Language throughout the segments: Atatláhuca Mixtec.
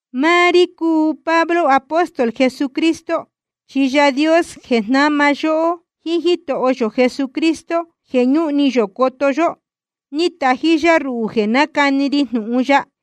Máá rí cúu Pablo, apóstol Jesucristo, chi Yaā Dios jeē jnáma yóhó, jíín Jítoho yō Jesucristo jeē ñúhun ni yō coto yó, ni catají yá ruhū jeē nácani ri jnūhun ya.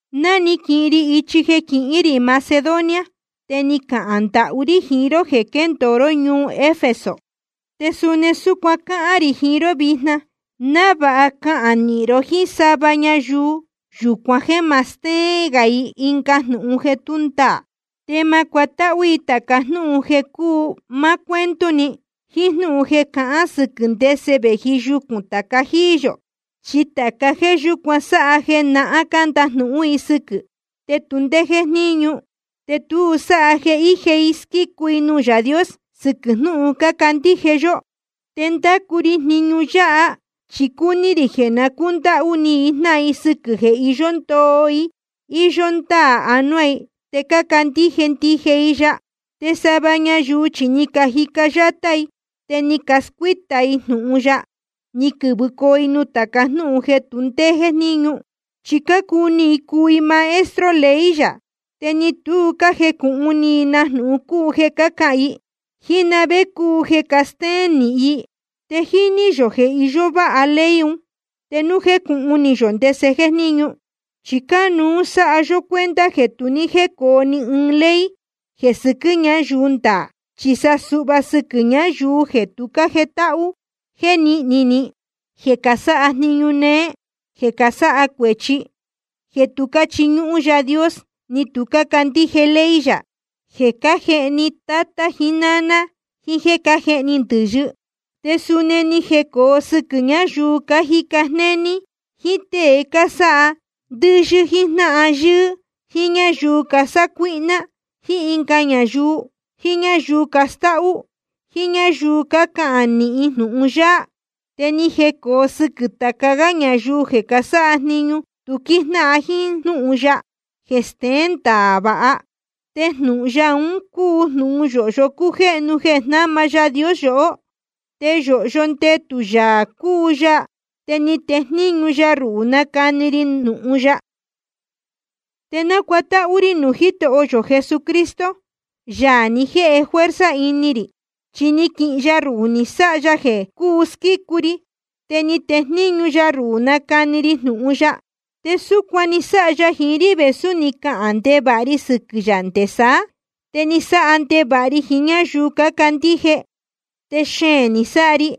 Ná ni quihin ri ichi jeē quihín rī Macedonia, te ni cahān ndahú rí jiín ró jeē quéndōo ró ñuu Efeso. Te suni súcuan cáhán rī jiín ró vijna, návāha cahān nīhin ró jíín sava ñayuu yúcuan jeē ma stéén i ɨnga jnūhun jeē tú ndaā. Te ma cuatáhú i tāca jnúhun jeē cúu máá cuento‑ni, jíín jnúhun jeē cahán sɨquɨ̄ ndese vēji yucūn tāca jíí yō. Chi tāca jéē yúcuan sáha jeē nahán cándajnūhún i sɨquɨ̄, te tu ndé jéjníñu, te tu sáha jeē íje i squícu i nuū Yaā Dios sɨquɨ̄ jnūhun cácandíje yó. Te ndácu ri jniñu yáha chi cúní rī jeē na cúndáhú ni i jnáhan i sɨquɨ̄ jeē iyó ndoo íyó ndáā anuá i, te cácandíje ndije i ya. Te sava ñayuu chi ni cajica yátá i, te ni cascuíta i jnūhun ya, ni quɨ̄vɨcoo i nuū tāca jnúhun jeē tu ndé jéjníñu. Chi cácuni i cuu i maestro ley yā, te ni tu cájecūhun ni i na jnūhun cúu jeē cácahān i, jíín na vé cúu jeē castéén nīhin i. Te jíní yō jeē iyó váha ley un, te núu jecūhun ni yō ndese jéjníñu. Chi cánuú sáha yó cuenta jeē tu ní jécōo ni ɨɨn ley jeē sɨquɨ́ ñayuu ndaā, chi sa suhva sɨquɨ̄ ñayuu jeē tu cájetáhú, jeē níhni ni, jeē casáha jniñu néé, jeē casáha cuēchi, jeē tu cáchiñúhún Yaā Dios ni tu cácandíje ley yā, jeē cájehni tatá jiín náná, jiín jéē cájehni ndɨ̄yɨ. Te suni ni jecōo sɨquɨ̄ ñáyuu cájica jnéní, jíín tée cásáha ndɨyɨ̄ jiín jnáhan yɨ́ɨ́, jíín ñáyuu casácuíhná ɨnga ñayuu, jiín ñáyuu castáhú, jíín ñáyuu cácahān nīhin jnūhun yáá. Te ni jecōo sɨquɨ̄ tāca gá ñayuu jeē casáha jniñu tu quíjnáhan jíín jnúhun ya jeē steén ndaā vāha. Te jnūhun ya un cúu jnūhun yōhyo jéhnu jeē jnáma Yaā Dios yohó. Te yōhyo ndetū Yaā cúu ya. Te ni tejníñu ya ruhū nácani ri jnūhun ya. Te nácuatáhú rí nuū Jítoho yō Jesucristo, Yaā ni jēhe fuerza ini rī, chi ni quihin ya ruhū ni sáha ya jeē cuu squícu ri, te ni tejníñu ya ruhū nácani ri jnūhun ya. Te súcuan ni sáha ya jiín rí vēsú ni cahān ndevāha ri sɨquɨ̄ yā nde saá, te ni sáha ndevāha ri jiín ñáyuu cácandíje, te xeēn ni sáha ri.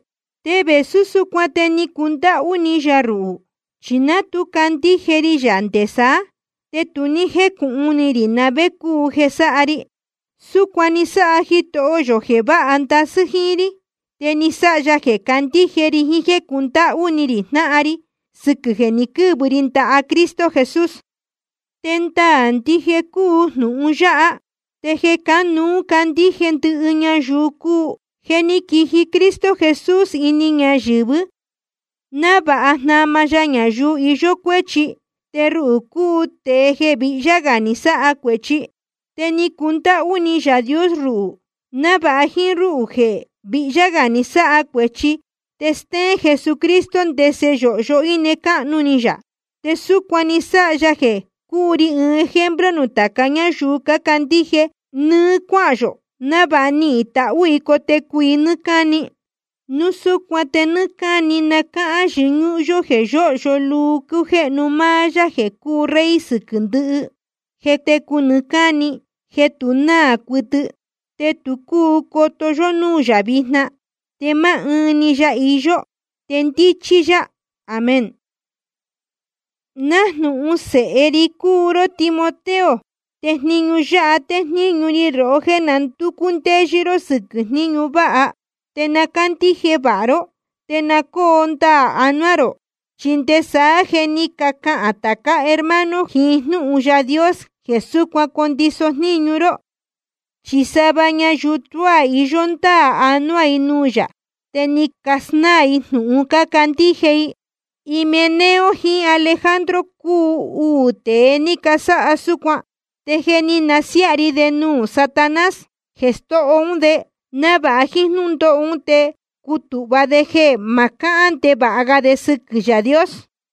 Te vēsú súcuan te ni cundáhú ni yā ruhū, chi ná tu candíje ri yā nde saá, te tu ní jécūhun ni rī na vé cúu jeē sáha ri. Súcuan ni sáha Jitoho yō jeē váha ndasɨ́ jíín rí. Te ni sáha ya jeē candíje ri jiín jéē cúndáhú ni rī jnáhan ri sɨquɨ̄ jeē ni quɨ́vɨ ri ndaha Cristo Jesús. Te ndaā ndije cúu jnūhun yáha, te jeē cánuú candíje ndɨhɨ ñayuu cúu: jeē ní quiji Cristo Jesús ini ñayɨ̄vɨ návāha jnama ya ñayuu iyó cuéchi. Te ruhū cúu tēe jeē vihyá gā ni sáha cuēchi. Te ni cundáhú ni Yaā Dios ruhū, návāha jíín rúhū jeē vihyá gā ni sáha cuēchi te stéén Jesucristo ndese yōhyo íne cáhnu ni yā. Te súcuan ni sáha ya jeē cúu ri ɨɨn ejemplo nuū tāca ñáyuu candíje nɨ́ɨ́ cuáhān yō, návāha nihīn tahú i cotecu i nɨ́ɨ́ cáni. Núu súcuan te nɨ́ɨ́ cáni na cáhán yɨñúhún yó jeē yóhyo luu cújéhnu máá Yaā jeē cúu Rey sɨquɨ̄ ndɨhɨ, jeē técu nɨɨ́ cáni, jeē tu náā cuɨtɨ. Te tu cúu coto yó núū yā vijna, te máá ɨɨn‑ni ya iyó, te ndíchí yá. Amén. Nájnūhun sēhe ri cúu ró Timoteo, te jniñu yáha téjníñu ri rohó, jéē na ndúcú ndéyɨ́ ró sɨ́quɨ̄ jníñu váha. Te na cándíje vāha ró, te na cóo ndaā anuá rō. Chi nde saá je ni cacahān tācá hermano jiín jnúhun Yaā Dios jeē súcuan condiso jníñu ró. Chi sava ñayuu tuá iyó ndáā anuá i nuū yā, te ni casnáā i jnūhun cácandíje i. Himeneo jiín Alejandro cúu uū tēe ni casáha súcuan. Te je ni siaá rī de nuū Satanás, jeē stóho ún de, návāha jíín jnúndóho ún te cutūhva de jeē ma cáhán ndevāha ga de sɨquɨ̄ Yaā Dios.